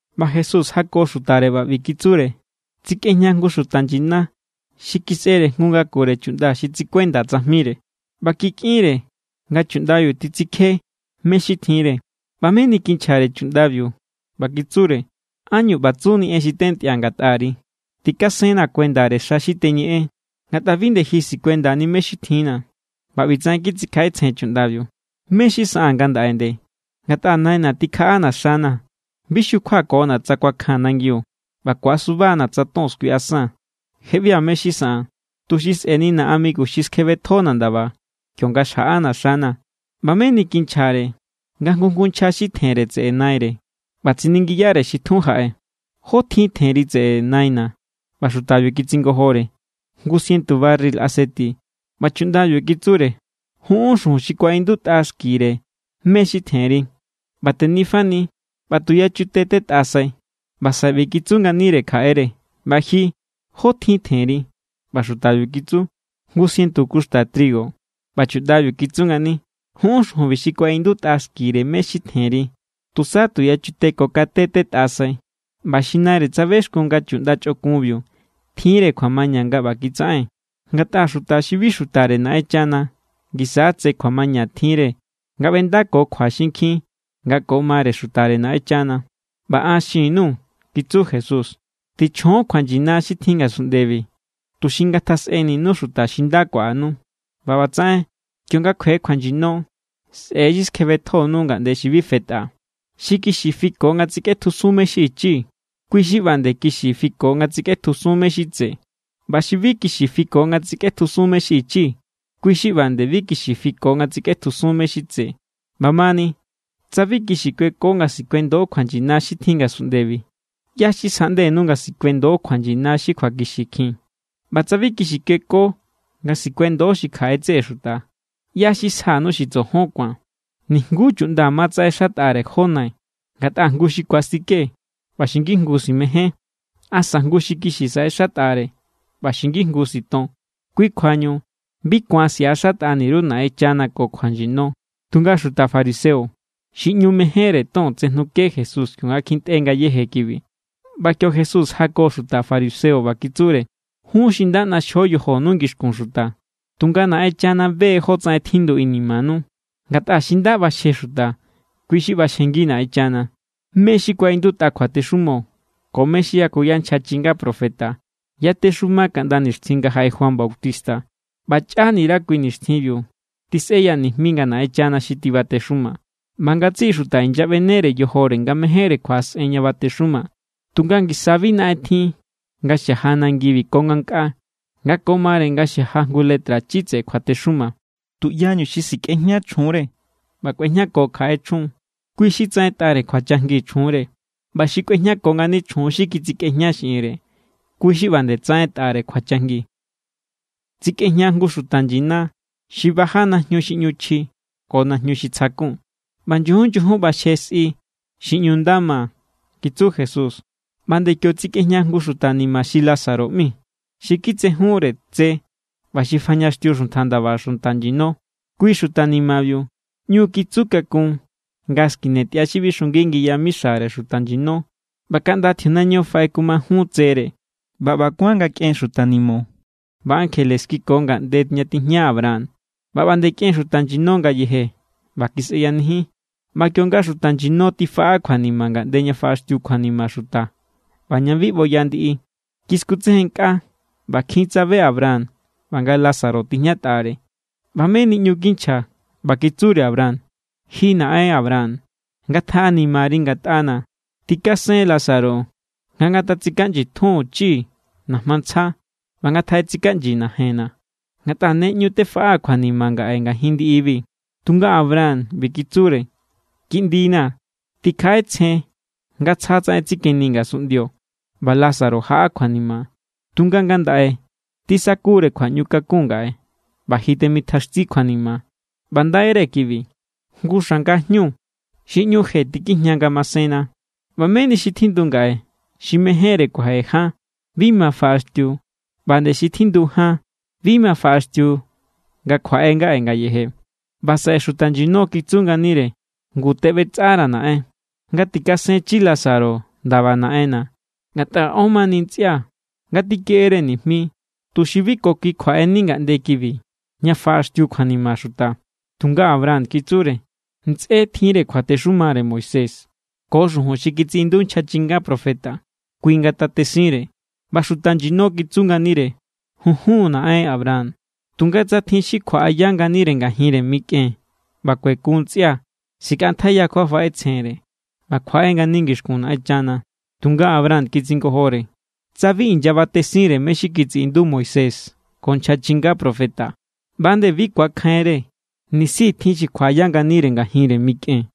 ꞌBa Jesús jako xutare ꞌba ꞌbi kitsure: —Tsikꞌejña jngu xuta nyina xi kisꞌere jngu ngakure chuꞌnda xi tsikuenda tsajmire. ꞌBa kikꞌinre nga chuꞌndabiu titsikje mé= xi tjinre. ꞌBa meni kinchjare chuꞌndabiu ꞌba kitsure: “¿Ánñu ꞌba tsuni en xi tentꞌia̱ ngatꞌari? Tikasennaa̱ kuendare xa xi teñeꞌen, ngatꞌa bi nde ji sikuendani mé= xi tjinna̱.” ꞌBa ꞌbitsaꞌen kitsikjaꞌetsjen chuꞌndabiu: “¿Mé= xi saꞌaa̱n ngandaꞌe nde? Ngatꞌa naina̱ tikjaꞌana̱ xana̱. Bi xukjuakona̱ tsa kuakjaa̱n nangiu, ꞌba ku̱asuba=na̱ tsa ton skuiꞌasaa̱n. Je ꞌbia̱ mé= xi saꞌaa̱n, tuxi sꞌe̱nina̱ amigu xi skjebetjona̱ ndaba, kionga xjaꞌana̱ xana̱.” ꞌBa meni kinchjare nga jngu jngu nchja xi tjenre tseꞌe naire. ꞌBa tsiningiyare xi tjun jaꞌe: “¿Jó tjin tjenri tseꞌe naina̱?” ꞌBa xutabiu kitsingojore: “Jngu sientu barril aseti.” ꞌBa chuꞌndabiu kitsure: “Junꞌún xujun xi kuaꞌindutꞌa xkire mé= xi tjenri ꞌba tenifani ꞌba tu yachute tꞌetꞌasai.” ꞌBa saꞌe ꞌbi kitsu nganire kjaꞌere: “ꞌBa ji, ¿jó tjin tjenri?” ꞌBa xutabiu kitsu: “Jngu sientu kuxta trigo.” ꞌBa chuꞌndabiu kitsu ngani: “Junꞌún xujunbi xi kuaꞌindutꞌa xkire mé= xi tjenri. Tusa tu yachute ko kate tꞌetꞌasai.” ꞌBa xi naire tsabexkun nga chuꞌnda chꞌokunbiu tjinre kjuamaña nga ꞌba kitsaꞌen. Ngatꞌa xuta xi bi xutare Naꞌenchana ngisa= tse kjuamaña tjinre nga ꞌbendako kjua xinkjin nga ko mare xutare Naꞌenchana. ’ꞌBa an xin_nuu̱ —kitsu Jesús—. Tichjon kjuanyina xi tjin ngasunꞌndebi, tuxi ngatjasꞌeninu xuta xi nda kuaꞌanu. ꞌBa ꞌbatsaꞌen, kionga kjue kjuanyino, sꞌe̱ xi skjebetjonu ngaꞌnde xi bi fetꞌa. ’Xi kixi fiko nga tsikꞌetjusun mé= xi ichi, kui= xi ꞌba nde kixi fiko nga tsikꞌetjusun mé= xi tse. ꞌBa xi bi kixi fiko nga tsikꞌetjusun mé= xi ichi, kui= xi ꞌba nde bi kixi fiko nga tsikꞌetjusun mé= xi tse. ꞌBamani, tsa bi kixi kueko nga sikuendo kjuanyina xi tjin ngasunꞌndebi, ¿ꞌyá= xi sjaꞌndenu nga sikuendo kjuanyina xi kjuakixikjin? ꞌBa tsa bi kixi kueko nga sikuendo xi kjaꞌe tseꞌe xuta, ¿ꞌyá= xi sjanu xi tsojon ku̱an? ’Nijngu chuꞌnda ma tsaꞌexatꞌare jó nai. Ngatꞌa jngu xi ku̱astike ꞌba xi ngijngu simején, asa jngu xi kixi saꞌexatꞌare ꞌba xi ngijngu siton. Kui kjuañu bi ku̱an siꞌaxatꞌani_ru Naꞌenchana ko kjuanyino. Tunga xuta fariseo, xi ꞌñu mejénre ton, tsejnuke Jesús kionga kjintꞌe ngayéje kibi. ꞌBa kio Jesús jako xuta fariseo, ꞌba kitsure: —Jún= xi nda ꞌnaxjio yojonu ngixkun xuta, tunga Naꞌenchana be= jotsaꞌen tjindu inimanu. Ngatꞌa xi nda ꞌbaxje xuta, kui= xi ꞌbaxjengi Naꞌenchana. ’Mé xi kuaꞌindutꞌa kjuatexumo ko mé= xi yakuya nchja chinga profeta yatexuma kaꞌnda nixtjin nga jaꞌe Juan Bautista. ꞌBa chꞌanire kui nixtjinbiu tisꞌeya nijmi nga Naꞌenchana xi tibatexuma, ꞌba ngatsiꞌi xuta inyaꞌbenere yojore nga mejénre kjuaꞌasꞌen ña batexuma. ’Tunga ngisa bi naꞌen tjin nga xaja nangibi ko ngankꞌaa nga ko mare nga xaja jngu letrachi tseꞌe kjuatexuma. ’Tuꞌyañu xi sikꞌejña chjunre ꞌba kꞌuejñako kjaꞌe chjun, kui= xi tsaꞌentꞌare kjuachajngi chjunre. ꞌBa xi kꞌuejñako ngani chjun xi kitsikꞌejña xiꞌinre, kui= xi ꞌba nde tsaꞌentꞌare kjuachajngi. ’Tsikꞌejña jngu xuta nyina xi baja najñu xi ꞌñu chji ko najñu xi tsjakun, ꞌba nyujun nyujun ꞌbaxje sꞌi xi ꞌñu nda ma —kitsu Jesús—. ꞌBa nde kio tsikꞌejña jngu xuta ni̱ma̱ xi Lázaro ꞌmi, xi kitsejunre tse ꞌba xi fajñaxtiu xuntja ndaba xuta nyino. Kui xuta ni̱ma̱biu ꞌñu kitsu kakun nga skine tꞌia xi bixungi ngi yamixare xuta nyino, ꞌba kaꞌnda tjiunaño faꞌekumajun tsere. ꞌBa ꞌba kuán nga kꞌen xuta ni̱mo̱ ꞌba ankjele kiko ngaꞌnde ña tijña Abraham. ꞌBa ꞌba nde kꞌen xuta nyino ngayeje ꞌba kisꞌeyanijin. ꞌBa kionga xuta nyino tifaꞌa kjuanima ngaꞌnde ña faꞌaxtiu kjuanima xuta ꞌba ña bi ꞌboya ndiꞌi, kiskutsejennkꞌa ꞌba kjin tsabe Abraham ꞌba nga Lázaro tijñatꞌare. ꞌBa meni ꞌñu kinchja, ꞌba kitsure Abraham: “Ji naꞌen Abraham, ngatjaꞌanimari ngatꞌana̱. Tꞌikasen Lázaro nga ngatatsikaꞌnyi tjunchi najma ntsja ꞌba ngatjaꞌetsikaꞌnyi najenna̱, ngatꞌa ne ꞌñu fefaꞌaa̱ kjuanima ngaꞌe ngajin ndiꞌibi.” Tunga Abraham ꞌbi kitsure: “Kiꞌndina̱, tikjaꞌetsjen nga tsja tsaꞌen tsikeni ngasunꞌndio, ꞌba Lázaro jaꞌa kjuanima. Tunga ngandaꞌe tisakure kjuaꞌñukakun ngaꞌe, ꞌba ji temitjaxti kjuanima. ꞌBa ndaire kibi, jngu xanga jñu xi ꞌñu je tikijña ngamasenna. ꞌBa meni xi tjindu ngaꞌe xi mejénre kuaje jan bi ma faꞌaxtiu. ꞌBa nde xi tjindu jan bi ma faꞌaxtiu nga kjuaꞌe ngaꞌe ngayeje.” ’ꞌBa saꞌe xuta nyino kitsu nganire: “Ngu, teꞌbetsꞌara̱, naꞌen, nga tikasenchi Lázaro ndaba naꞌenna̱, ngatꞌa ón mani ntsꞌia̱. Ngatjikeꞌere nijmi, tuxi bi ko kui kjuaꞌeni ngaꞌnde kibi ña faꞌaxtiu kjuanima xuta.” Tunga Abraham kitsure: “Ntsꞌé tjinre kjuatexumare Moisés ko xujun xi kitsiꞌindu nchja chinga profeta. Kui ngatate sinre.” ꞌBa xuta nyino kitsu nganire: “Junjun, naꞌen Abraham. Tunga tsa tjin xi kjuaꞌaya nganire ngajinre mikꞌen ꞌba kuekun ntsꞌia̱, sikꞌantjaiya kjuafaꞌetsjenre ꞌba kjuaꞌe ngani ngixkun Naꞌenchana.” Tunga Abraham kitsingojore: “Tsa bi inyabatesinre mé= xi kitsiꞌindu Moisés ko nchja chinga profeta, ꞌba nde bi ku̱akjainre nisi tjin xi kjuaꞌaya nganire ngajinre mikꞌen.”